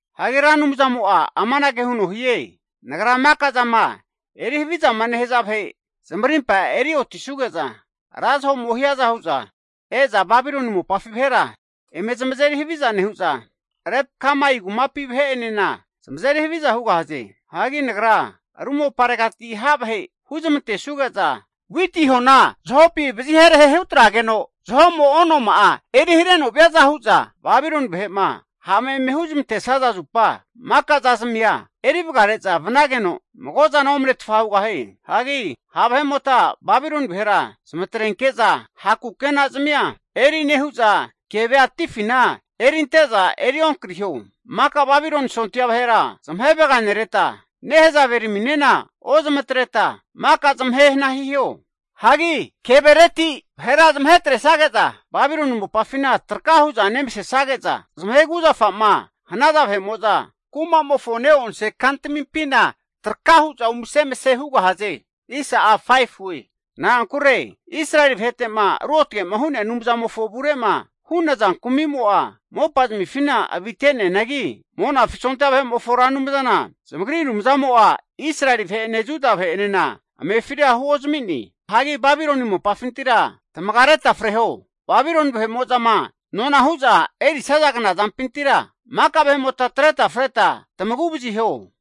Hagi Ra Anumzamo'a amanage huno hie, Nagra maka zama eri havizama nehaza vahe zamarimpa eri otisuge'za, ra zaho'mo hiaza hu'za e'za Babiloni mopafi vahera eme zamazeri haviza nehu'za, Leb-kamai kumapi vahe'enena zamazeri haviza hugahaze. Hagi Nagra ru moparegati ha' vahe huzamantesuge'za e'za witi hona zahopi vazi herahe hutrageno zaho'mo onoma'a eri hareno viaza hu'za Babiloni vahe'ma ha'ma eme huzmantesaza zupa, maka zazamia eri vagare'za vanageno mago zana omanetfa hugahie. Hagi ha' vahe'mota Babiloni vahera zamatrenke'za ha' kukena zamia eri nehu'za, kevea atifina erinte'za eri onkariho. Maka Babiloni sondia vahera zamahe vaganereta, nahezave raminena ozamatreta maka zamahe hana hiho. Hagi kevereti vahera zamahe atresage'za Babiloni mopafina traka huza nemasesage'za, zamahe kuzafa'ma hanaza vahe'mo'za kumamofo ne'onse kantamimpina traka hu'za umase emase hugahaze. Na'ankure Israeli vahete'ma ruotage'ma hu'nea Anumzamofo avure'ma hu'naza kumimo'a mopazmifina avite'neanagi, Monafi sondia vahe'mofo Ra Anumzana zamagri Anumzamo'a Israeli vahe'ene Juda vahe'enena amefira huozami'ne. Hagi Babiloni mopafintira tamagareta freho. Babiloni vahe'mo'zama nona hu'za erisaza knazampintira maka vahe'mota atreta freta tamagu'vaziho.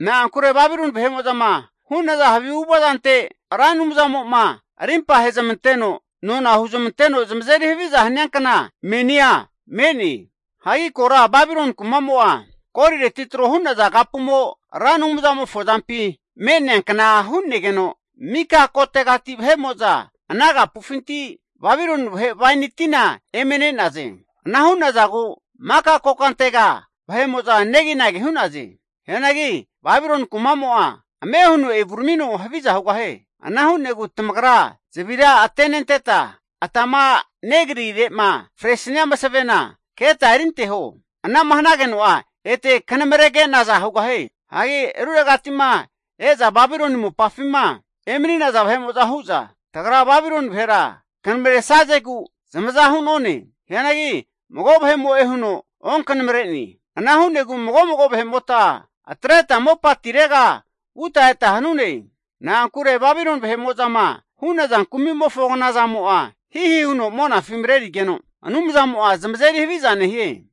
Na'ankure Babiloni vahe'mo'zama hu'naza havi avu'ava zante Ra Anumzamo'ma arimpa ahezmanteno nona huzmanteno zamazeri haviza hania kna menia me'ne. Hagi kora Babiloni kumamo'a, golireti tro hu'naza kapumo Ra Anumzamofo azampi me'neankna hu'negeno, mika kotegati vahe'mo'za ana kapufinti Babiloni vahe waini tina eme ne'naze. Ana hu'nazagu maka kokantega vahe'mo'za neginagi hu'naze. Hianagi Babiloni kumamo'a ame huno evuramino haviza hugahie. Ana hu'negu tamagra zavira atenenteta atama negrire'ma fresania masavena keta erinteho. Ana'ma hanageno'a ete kanamarege nazana hugahie. Hagi ruregati'ma e'za Babiloni mopafima emani'naza vahe'mo'za hu'za, tagra Babiloni vahera knamaresazegu zamaza hu'none. Hianagi mago vahemo'e huno onkanamare'ne. Ana hu'negu mago mago vahe'mota atreta mopatirega vuta eta hanune. Na'ankure Babiloni vahe'mo'zama hu'naza kumi'mofo knazamo'a hihi huno monafi mareri'negeno Anumzamo'a zamazeri haviza nehie.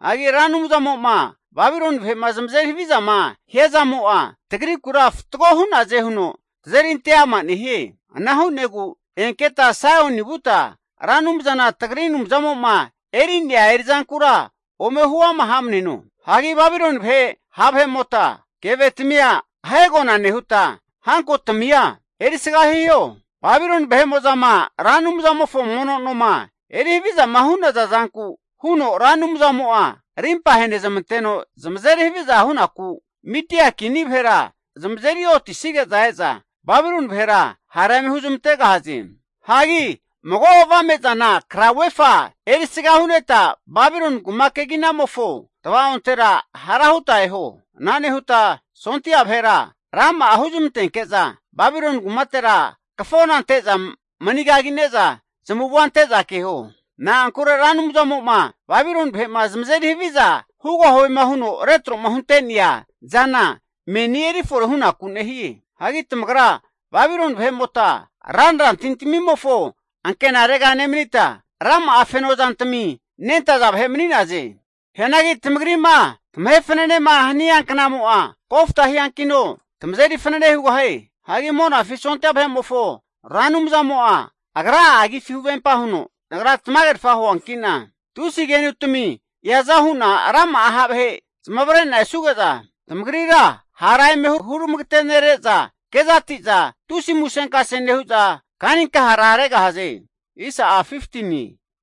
Hagi Ra Anumzamo'ma Babiloni vahe'ma zamazeri havizama hia zamo'a, tagrikura fatgo hunaze huno tazerinte ama nehie. Ana hu'negu enketa Saioni vuta Ra Anumzana tagri Anumzamo'ma eri'nea eri'zankura ome huama hamneno. Hagi Babiloni vahe ha' vahe'mota kevetamia ahegona nehuta hankotamia erisga hiho. Babiloni vahe'mo'zama Ra Anumzamofo mono noma eri havizama hu'naza zanku huno, Ra Anumzamo'a arimpa ahenezmanteno zamazeri haviza hunaku, Midia kini vahera zamazeri otisige'za e'za Babiloni vahera hara eme huzmantegahaze. Hagi mago avame zana krauvefa (flek) erisga hu'neta Babiloni kuma keginamofo tva'ontera hara huta eho. Ana nehuta sondia vahera rama'a huzmantenke'za Babiloni kumatera kafona ante'za mani kagine'za zamavua ante'za keho. Na'ankura Ra Anumzamo'ma Babiloni vahe'ma zamazeri haviza hugahuema huno retro'ma hunte'nea zana meni erifore hunaku nehie. Hagi tamagra Babiloni vahe'mota ranra tintamimofo ankenarega nemanita, rama'a feno zantami nentaza vahe mani'naze. Hianagi tamagri'ma tamahe fananema hania knamo'a kofta hiankino tamazeri fanene hugahie. Hagi Monafi sondia vahe'mofo Ra Anumzamo'a agra'a agifi huvempa huno, Nagra tamagerfa huanki'na tusi kenutami eaza hu'na rama'a ha' vahe zamavare'na esuge'za, tamagrira hara eme huramagetenere'za kezati'za tusi musenkase nehu'za kanikahara regahaze.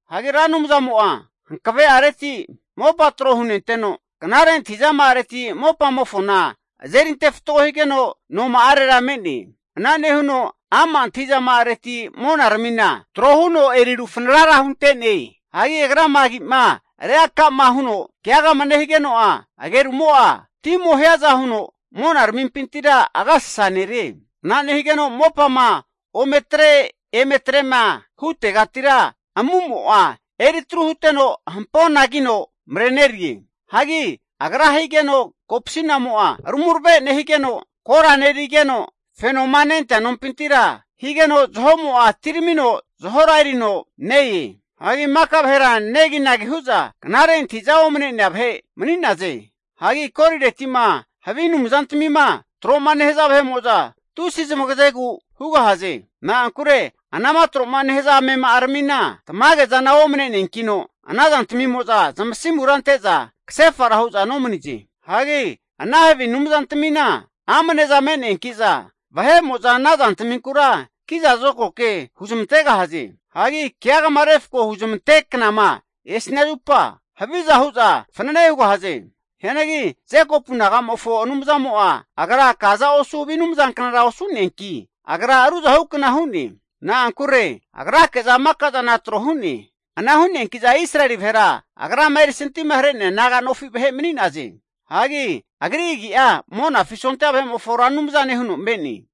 Hagi Ra Anumzamo'a hankave'areti mopa tro hunenteno, knare antahizama'areti mopamofona azerinte fatgo higeno noma'arera me'ne. Ana nehuno ama' antahi'zama'areti monaramina tro huno eri rufanara hunte'ne. Hagi Agrama agi'ma reaka'ma huno keagama nehigeno'a, agerumo'a timo hiaza huno monaramimpintira agasasa nerie. Ana nehigeno mopama ome tre eme atrema hutegatira amu'mo'a eri tru huteno hampona kino marenerie. Hagi Agra higeno kopasi'namo'a rumarave nehigeno, kora nerigeno, fenoma nentea nompintira higeno zahomo'a atiramino zahora erino ne-e. Hagi mika vahera neginagi hu'za knare antahi'za omane'nea vahe mani'naze. Hagi golireti'ma havi anumzantamima tro'ma nehaza vahe'mo'za tusi zamagazegu hugahaze. Na'ankure anama tro'ma nehaza amema'aramina tamage zana omane'neankino ana zantamimo'za zamasimura ante'za kasefara hu'za nomanize. Hagi ana havi anumzantamina amneza me'neanki'za, vahe'mo'za ana zantaminkura kiza zokago ke huzamantegahaze. Hagi keagama refko huzamante knama esania zupa, haviza hu'za fanane hugahaze. Hianagi Jekopu nagamofo Anumzamo'a Agra kaza osu havi anumzanknara osu'neanki, Agra ruzahukna hu'ne. Na'ankure Agrake'za maka zana tro hu'ne. Ana hu'neanki'za Israeli vahera Agrama erisantima hare'nea naga nofi vahe mani'naze. Hagi Agri agi'a Monafi sondia vahe'mofo Ra Anumzane huno me'ne.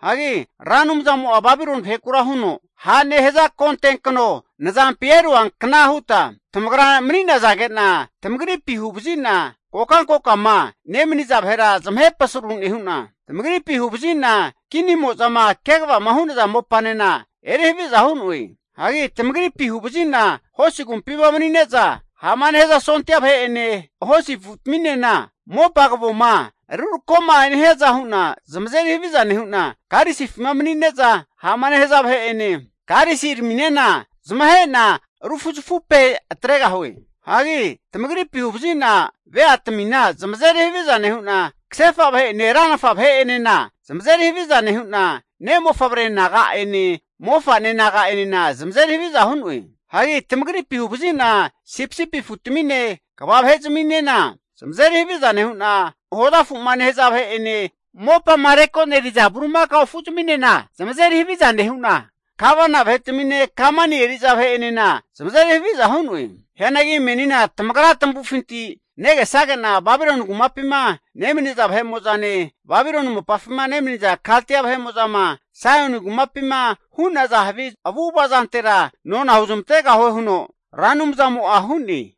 Hagi Ra Anumzamo'a Babiloni vahekura huno, Ha' nehaza konte kano nazampi eruankna huta tamagra mani'nazage'na tamagripi huvazi'na kokankokama nemaniza vahera zamahe pasaru nehu'na, tamagripi huvazina kinimo'zama kegavama hu'naza mopanena eri haviza hu'noe. Hagi tamagripi huvazi'na hosi agumpima manine'za ha'ma nehaza sondia vahe'ene hosi afutaminena mopa kavoma rurako'ma nehiaza hu'na zamazeri haviza nehu'na, karisifima manine'za ha'ma nehaza vahe'ene karisi raminena zamahe'na rufuzafupe atre'noe. Hagi tamagripi huvazi'na veatamina zamazeri haviza nehu'na, kasefa vahe'ene ranafa vahe'enena zamazeri haviza nehu'na, ne' mofavre naga'ene mofa'ne naga'enena zamazeri haviza hu'noe. Hagi tamagripi huvazi'na sipisipi afutamine kva vahe'zminena zamazeri haviza nehu'na, hoza afu'ma nehaza vahe'ene mopama rekoneriza bulimakao afuzminena zamazeri haviza nehu'na, gavana vahetamine kamani eri'za vahe'enena zamazeri haviza hu'noe. Hianagi menina tamagra tamavufinti negesage'na Babiloni kumapima nemaniza vahemo'zane Babiloni mopafima nemaniza Kaldia vahe'mo'zama Saioni kumapima hu'naza havi zamavu'zamava zantera nona huzmantegahue, huno Ra Anumzamo'a hu'ne.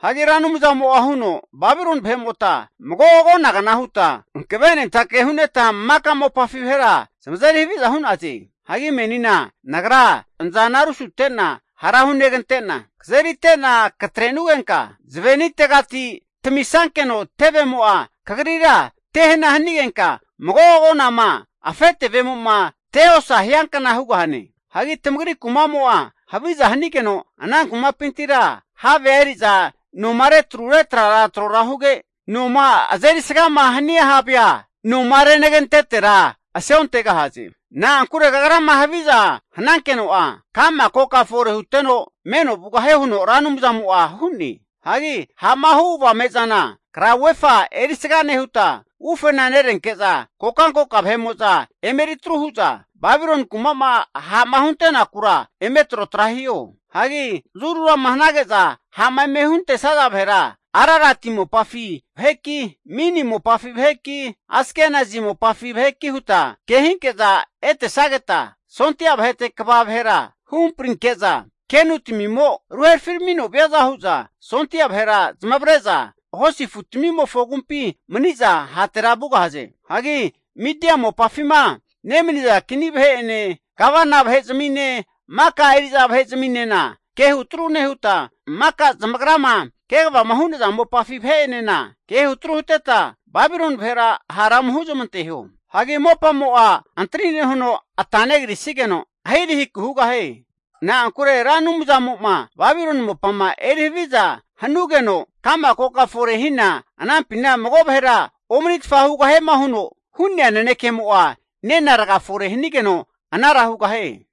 Hagi Ra Anumzamo'a huno, Babiloni vahe'mota mago agonagna huta hankavenentake hu'neta maka mopafi vahera zamazeri haviza hu'naze. Hagi menina Nagra nazana rusute'na hara hunegante'na, kazerite'na katrenugenka zavenitegati tamisankeno tevemo'a kagrira tehana hanigenka, mago agonama afe tevemo'ma teosa hiankna hugahane. Hagi tamagri kumamo'a haviza hanigeno ana kumapintira havea eri'za noma retrure trara tro huge, noma azeri sgama hania havea, noma renagentetera aseontegahaze. Na'ankure kagrama haviza hanankeno'a, ka'ma koka fore huteno meno vugahie, huno Ra Anumzamo'a hu'ne. Hagi ha'ma hu avame'zana krauvefa erisaga nehuta ufena nerenke'za kokankoka vahe'mo'za eme eri atru hu'za Babiloni kuma'ma ha'ma hunte'nakura eme trotra hiho. Hagi zurunama hanage'za ha'ma eme huntesaza vahera, Ararati mopafi vaheki, Mini mopafi vaheki, Askenazi mopafi vaheki huta kehinke'za etesageta, sondia vahete kva vahera huhamprinke'za, kenu tamimo ruherafiramino viaza hu'za, sondia vahera zamavare'za hosi afutamimofo agumpi mani'za hatera vugahaze. Hagi Midia mopafima nemaniza kini vahe'ene gavana vahe zamine, maka eri'za vahe zaminena kehu tru nehuta, maka zamagrama kegavama hu'naza mopafi vahe'enena kehu atru huteta Babiloni vahera hara ome huzmanteho. Hagi mopamo'a antri nehuno ata negrisigeno ahirahiku hugahie. Na'ankure Ra Anumzamo'ma Babiloni mopama eri haviza hanugeno kama koka fore hina anampina mago vahera omanitfa hugahiema huno hu'ne nanekemo'a nena raga fore hanigeno anara hugahie.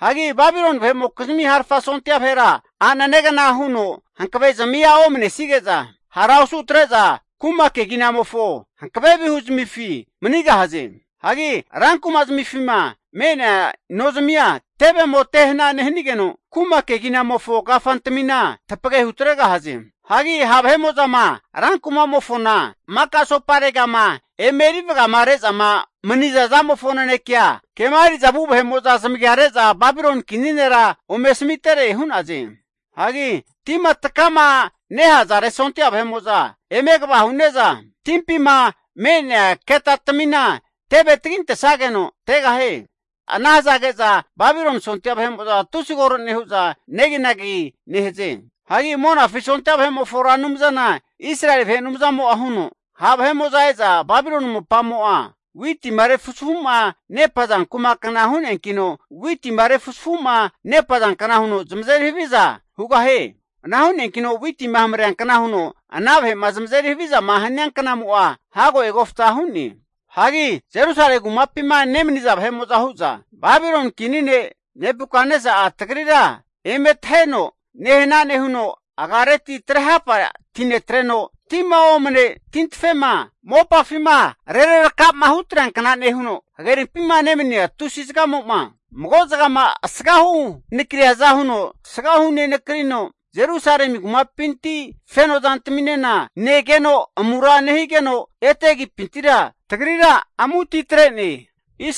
Hagi Babiloni vahe'mokizmi harfa sondia vahera a'nenegna huno hankavezmia omanesige'za hara osu atre'za, kuma keginamofo hankave vihu zamifi manigahaze. Hagi rankuma zamifima me'nea nozamia tevemo te hana nehanigeno, kuma keginamofo kafantamina tapage hutregahaze. Hagi ha' vahe'mo'zama ran kumamofona maka asoparegama eme eri vagare'zama maniza zamofo nanekea, kema eri'za vu vahe'mo'za zamagia re'za Babiloni kini nera ome asamitere hu'naze. Hagi tima takama nehazare sondia vahe'mo'za eme kva hu'ne'za, timpima me'nea ketatamina teve tagintesageno tegahie. Ana hazage'za Babiloni sondia vahe'mo'za tusi koro nehu'za neginagi negahaze. Hagi Monafi sondia vahe'mofo Ra Anumzana Israeli vahe Anumzamo'a huno, Ha' vahe'mo'za e'za Babiloni mopamo'a witima refuzafuma nepaza kumakna hu'neankino witima refuzafuma nepazankna hu'za zamazeri haviza hugahaze. Ana hu'neankino witima hamareankna huno ana vahe'ma zamazeri havizama hania knamo'a hago egofta hu'ne. Hagi Jerusalemi kumapima nemaniza vahe'mo'za hu'za, Babiloni kini ne' Nebukatnesa'a tagrira eme taheno nehana nehuno, agareti trehapa tinetreno, tima omane tintafema mopafima rerarakama hutreankna nehuno, hagerimpima nemania tusi zagamo'ma mago zagama asgahu nakriaza huno tasga hu'nenakrino, Jerusalemi kumapinti feno zantaminena negeno amura nehigeno, ete agipintira tagrira amuti tre'ne.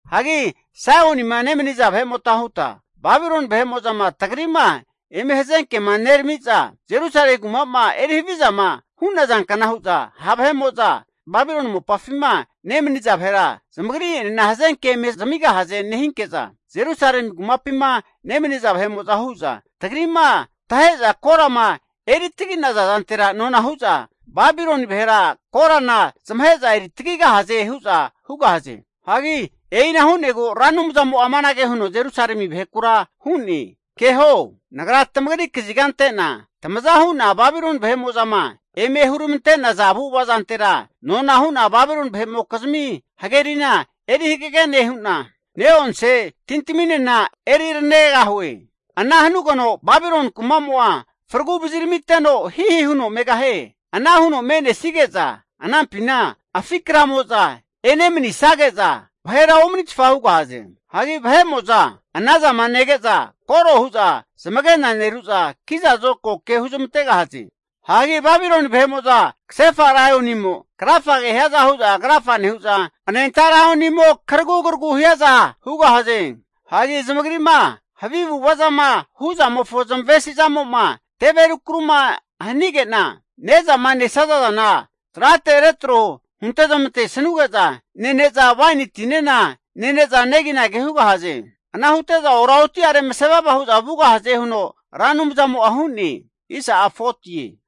Hagi Saionima nemaniza vahe'mota huta, Babiloni vahe'mo'zama tagri'ma eme hazenkema nerami'za Jerusalemi kuma'ma eri havizama hu'nazankna hu'za ha' vahe'mo'za Babiloni mopafima nemaniza vahera zamagri'enena hazenke eme zamigahaze nehinke'za, Jerusalemi kumapima nemaniza vahe'mo'za hu'za, tagri'ma tahe'za korama eri tagi'naza zantera nona hu'za, Babiloni vahera korana zamahe'za eri tagigahaze hu'za hugahaze. Hagi e'ina hu'negu Ra Anumzamo'a amanage huno Jerusalemi vahekura hu'ne. Keho, Nagra tamagri kaziga ante'na tamaza hu'na Babiloni vahe'mo'zama eme huramante'naza avu'ava zantera nona hu'na Babiloni vahe'mokizmi hagerina eri hagage nehu'na, ne'onse tintaminena eri ranegahue. Ana hanugeno Babiloni kumamo'a fragu vaziramiteno hihi huno megahie. Ana huno me'nesige'za anampina afi kramo'za enemanisage'za vahera omanitfa hugahaze. Hagi vahe'mo'za anazama nege'za koro hu'za zamagena neru'za, kiza zokago ke huzmantegahaze. Hagi Babiloni vahe'mo'za kasefa laionimo krafage hiaza hu'za krafa nehu'za, anenta laionimo karagugaragu hiaza hugahaze. Hagi zamagrima havi avu'ava zama hu' zamofo zamavesi zamo'ma teve rukaru'ma hanige'na, ne'zama nesaza zana trate retro hunte zamantesanuge'za nene'za waini tinena nene'za neginagi hugahaze. Ana hute'za oraoti'are mase vava hu'za vugahaze, huno Ra Anumzamo'a hu'ne.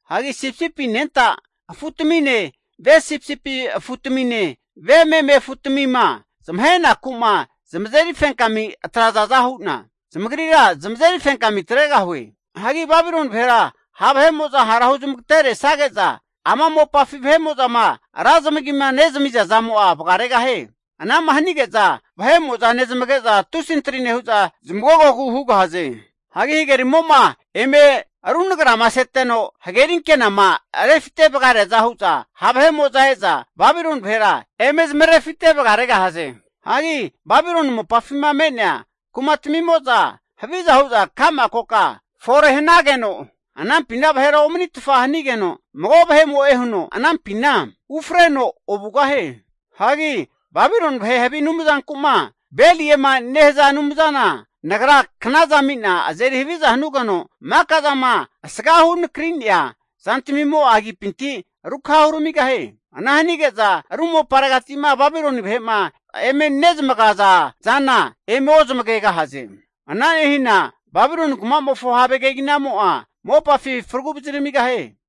Hagi sipisipi anenta afu'tamine, ve sipisipi afutamine ve meme afu'tamima zamahenaku'ma zamazeri fenkami atrazaza hu'na, zamagrira zamazeri fenkami atregahue. Hagi Babiloni vahera ha' vahe'mo'za hara huzmagateresage'za ama mopafi vahe'mo'zama ra zamagima nezamiza zamo'a vagaregahie. Ana'ma hanige'za vahe'mo'za nezamage'za tusi antri nehu'za zamagogogu hugahaze. Hagi hagerimo'ma eme runagrama seteno hageri ankenama rufite vagareaza hu'za, ha' vahe'mo'za e'za Babiloni vahera eme zamarefite vagaregahaze. Hagi Babiloni mopafima me'nea kumatamimo'za haviza huza ka'ma koka fore hanageno, anampina vahera omanitfa hanigeno, mago vahemo'e huno anampina ufreno ovugahie. Hagi Babiloni vahe havi anumzanku'ma Beliema nehaza anumzana, Nagra knaza ami'na azeri haviza hanugeno, maka zama asgahu nakri'nea zantamimo'a agipinti rukha huramigahie. Ana hanige'za ru moparegati'ma Babiloni vahe'ma eme nezamagaza zana eme ozmagegahaze. Ana nehina Babiloni kumamofo have keginamo'a mopafi faragu vaziramigahie.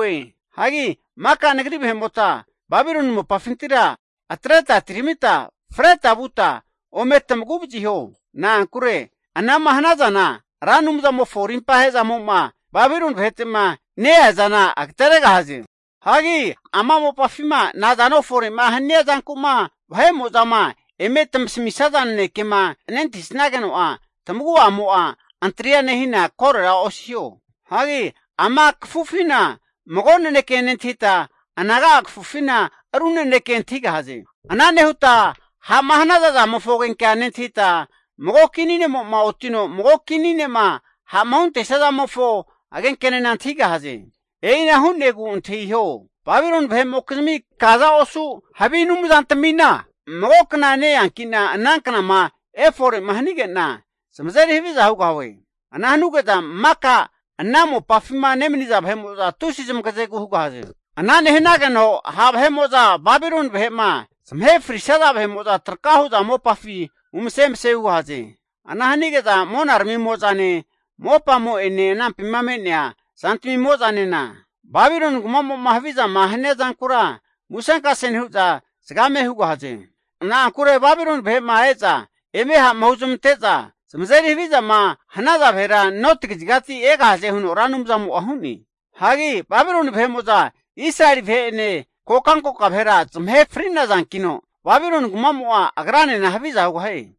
Hagi mika Nagri vahe'mota Babiloni mopafintira atreta atiramita freta vuta ome tamagu vaziho. Na'ankure ana'ma hanazana Ra Anumzamofo arimpahe zamo'ma Babiloni vahete'ma ne-ea zana agateregahaze. Hagi ama mopafima nazano fore'ma hania zanku'ma vahe'mo'zama eme tamasamisaza nanekema nentahisnageno'a, tamagu'amo'a antria nehina korora osiho. Hagi ama kafufina mago naneke nentahita, anaga'a kafufina ru naneke antahigahaze. Ana nehuta ha'ma hanaza zamofo agenkea nentahita, mago kini nemo'ma otino mago kini ne'ma ha'ma huntesia zamofo agenkenena antahigahaze. E'ina hu'negu antahiho! Babiloni vahe'mokizmi kaza osu havi anumzantamina, mago kna ne-eanki'na ana knama efore'ma hanige'na, zamazeri haviza hugahue. Ana hanuge'za maka ana mopafima nemaniza vahe'mo'za tusi zamagazegu hugahaze. Ana nehanageno ha' vahe'mo'za Babiloni vahe'ma zamahe frisaza vahe'mo'za traka hu'za mopafi umase emase hugahaze. Ana hanige'za monaramimo'zane, mopamo'ene anampima me'nea zantami'mo'zanena, Babiloni kumamo'ma havizama hania zankura musenkase nehu'za zagame hugahaze. Na'ankure Babiloni vahe'ma e'za eme ha'ma huzamante'za zamazeri havizama hanaza vahera noti kazigati egahaze, huno Ra Anumzamo'a hu'ne. Hagi Babiloni vahe'mo'za Israeli vahe'ene kokankoka vahe'enena zamahe fri'nazankino, Babiloni kumamo'a agranena haviza hugahie.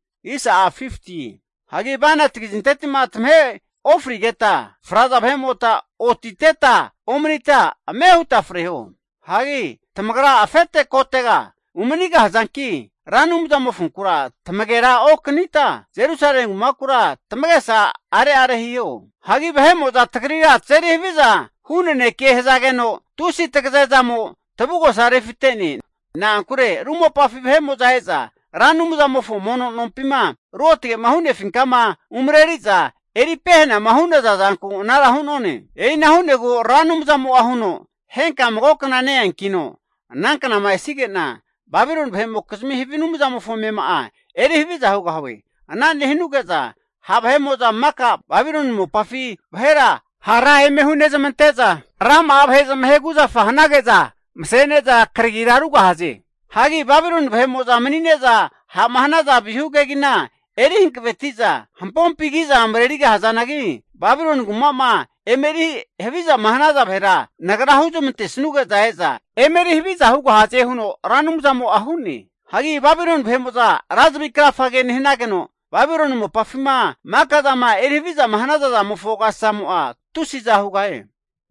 Hagi bainati kazinteti'ma tamahe ofrisageta fraza vahe'mota otiteta omanita ame huta freho. Hagi tamagra afete kotega umanigahazanki, Ra Anumzamofonkura tamagera okanita, Jerusalemi kumakura tamagesa are'are hiho. Hagi vahe'mo'za tagrira tazeri haviza hu naneke hazageno, tusi tagaze zamo tavugosa refite'ne. Na'ankure ru mopafi vahe'mo'za e'za Ra Anumzamofo mono nompima, ruotage'ma hu'nefinkama umareriza eri pehanama hu'naza zanku anara hu'none. E'ina hu'negu Ra Anumzamo'a huno, henka mago kna ne-eankino ana knama esige'na, Babiloni vahe'mokizmi havi anumzamofo amema'a eri haviza hugahue. Ana nehanuge'za ha' vahe'mo'za maka Babiloni mopafi vahera hara eme hunezamante'za, rama'a vahe zamahe kuzafa hanage'za masene'za karagi rugahaze. Hagi Babiloni vahe'mo'za manine'za ha'ma hanaza vihua kegina eri hankaveti'za hampompi kiza marerigahazanagi, Babiloni kuma'ma eme eri havizama hanaza vahera, Nagra huzmante sanuge'za e'za emeri haviza hugahaze, huno Ra Anumzamo'a hu'ne. Hagi Babiloni vahe'mo'za ra zavi krafa nehanageno, Babiloni mopafima maka zama eri haviza hanaza zamofo agasasamo'a tusiza hugahie.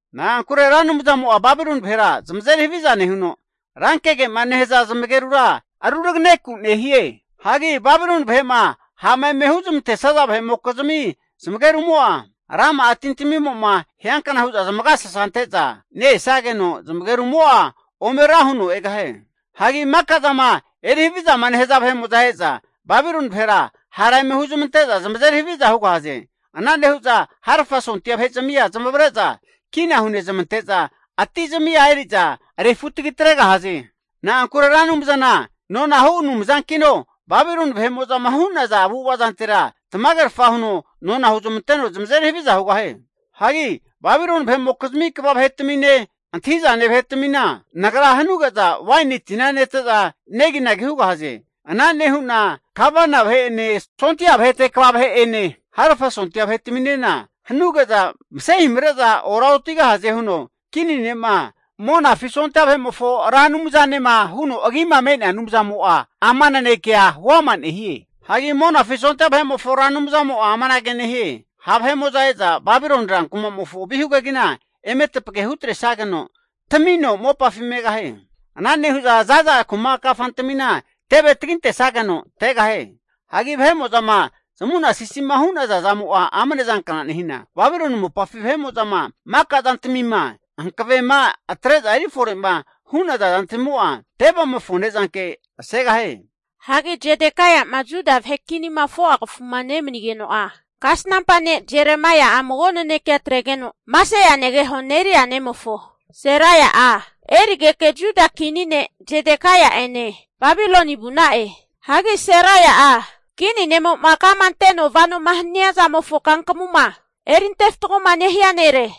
Na'ankure Ra Anumzamo'a Babiloni vahera zamazeri haviza nehuno, rankege'ma nehaza zamagerura ruraganeku nehie. Hagi Babiloni vahe'ma ha'ma eme huzmantesaza vahe'mokizmi zamagerumo'a, rama'a tintamimo'ma hiankna hu'za zamagasasa ante'za ne-esageno, zamagerumo'a ome rahuno egahie. Hagi maka zama eri havizama nehaza vahe'mo'za e'za Babiloni vahera hara eme huzmante'za zamazeri haviza hugahaze. Ana nehu'za harafa sondia vahe'zamia zamavare'za kina hunezamante'za, ati zamia eri'za refutagi atregahaze. Na'ankure Ra Anumzana nonahu Anumzankino, Babiloni vahe'mo'zama hu'naza avu'ava zantera tamagerfa huno nona huzmanteno zamazeri haviza hugahie. Hagi Babiloni vahe'mokizmi kva vahetamine, antahi'zane vahetaminena, Nagra hanuge'za waini tina nete'za neginagi hugahaze. Ana nehu'na gavana vahe'ene, sondia vahete kva vahe'ene, harafa sondia vahetaminena hanuge'za masehimare'za ora otigahaze, huno Kini ne'ma Monafi sondia vahe'mofo Ra Anumzanema huno Agima me'nea Anumzamo'a ama ana naneke huama nehie. Hagi Monafi sondia vahe'mofo Ra Anumzamo'a amanage nehie, ha' vahe'mo'za e'za Babiloni ran kumamofo vihu kegina eme tapage hutresageno tamino mopafi megahie. Ana nehu'za zaza kuma kafantamina teve tagintesageno tegahie. Hagi vahe'mo'zama zamu'na sisima hu'naza zamo'a amne zankna nehina, Babiloni mopafi vahe'mo'zama maka zantamima, hankavema atre'za eri fore'ma hu'naza zantamimo'a tevemofo ne'zanke asegahie. Hagi Zedekaia'ma Juda vahe kinima 4'a kafuma nemanigeno'a, kasnampa ne' Jeremaia'a mago naneke atregeno Maseia negeho Neria nemofo Seraia'a erigeke Juda kini ne' Zedekaia'ene Babiloni vu'na'e. Hagi Seraia'a kini ne'mo'ma kama anteno vanoma haniazamofo kankamuma erinte fatgoma nehia nere.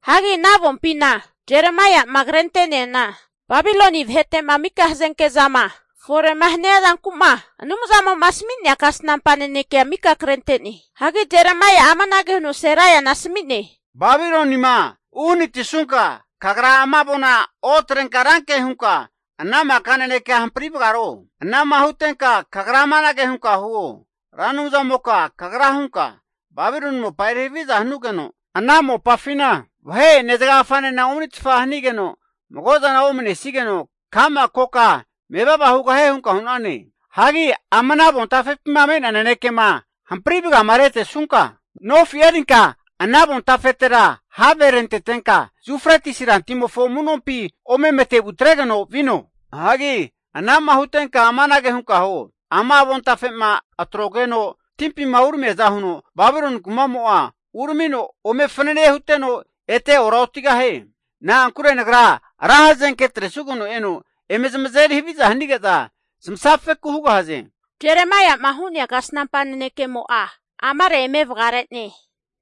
Hagi ana avompima Jeremaia'ma krente'neana Babiloni vahete'ma mika hazenke zama fore'ma hania zanku'ma, Anumzamo'ma asami'nea kasnampa nanekea mika krente'ne. Hagi Jeremaia'a amanage huno Seraiana asami'ne, Babilonima uhanati'sunka, kagra ama avona otrenka ranke hunka ana maka nanekea hampri vagaro. Ana'ma hutenka kagra amanage hunka huo, Ra Anumzamoka Kagra hunka, Babiloni mopa eri haviza hanugeno, ana mopafina vahe'ene zagagafanena omanitfa hanigeno mago zana omanesigeno ka'ma koka mevava hugahie hunka hu'nane. Hagi ama avontafepima me'nea nanekema hampri vagamaretesunka, nofi erinka ana avontafetera have rentetenka, Yufretisi rantimofo amu'nompi ome matevu atregeno vino. Hagi ana'ma hutenka amanage hunka huo. Ama avontafe'ma atrogeno timpima uramiaza huno, Babiloni kumamo'a uramino ome fanane huteno, ete ora otigahie. Na'ankure Nagra ra hazenke atresugeno eno eme zamazeri haviza hanige'za zamasafeku hugahaze. Jeremaia'ma hu'nea kasnampa nanekemo'a amare eme vagare'ne.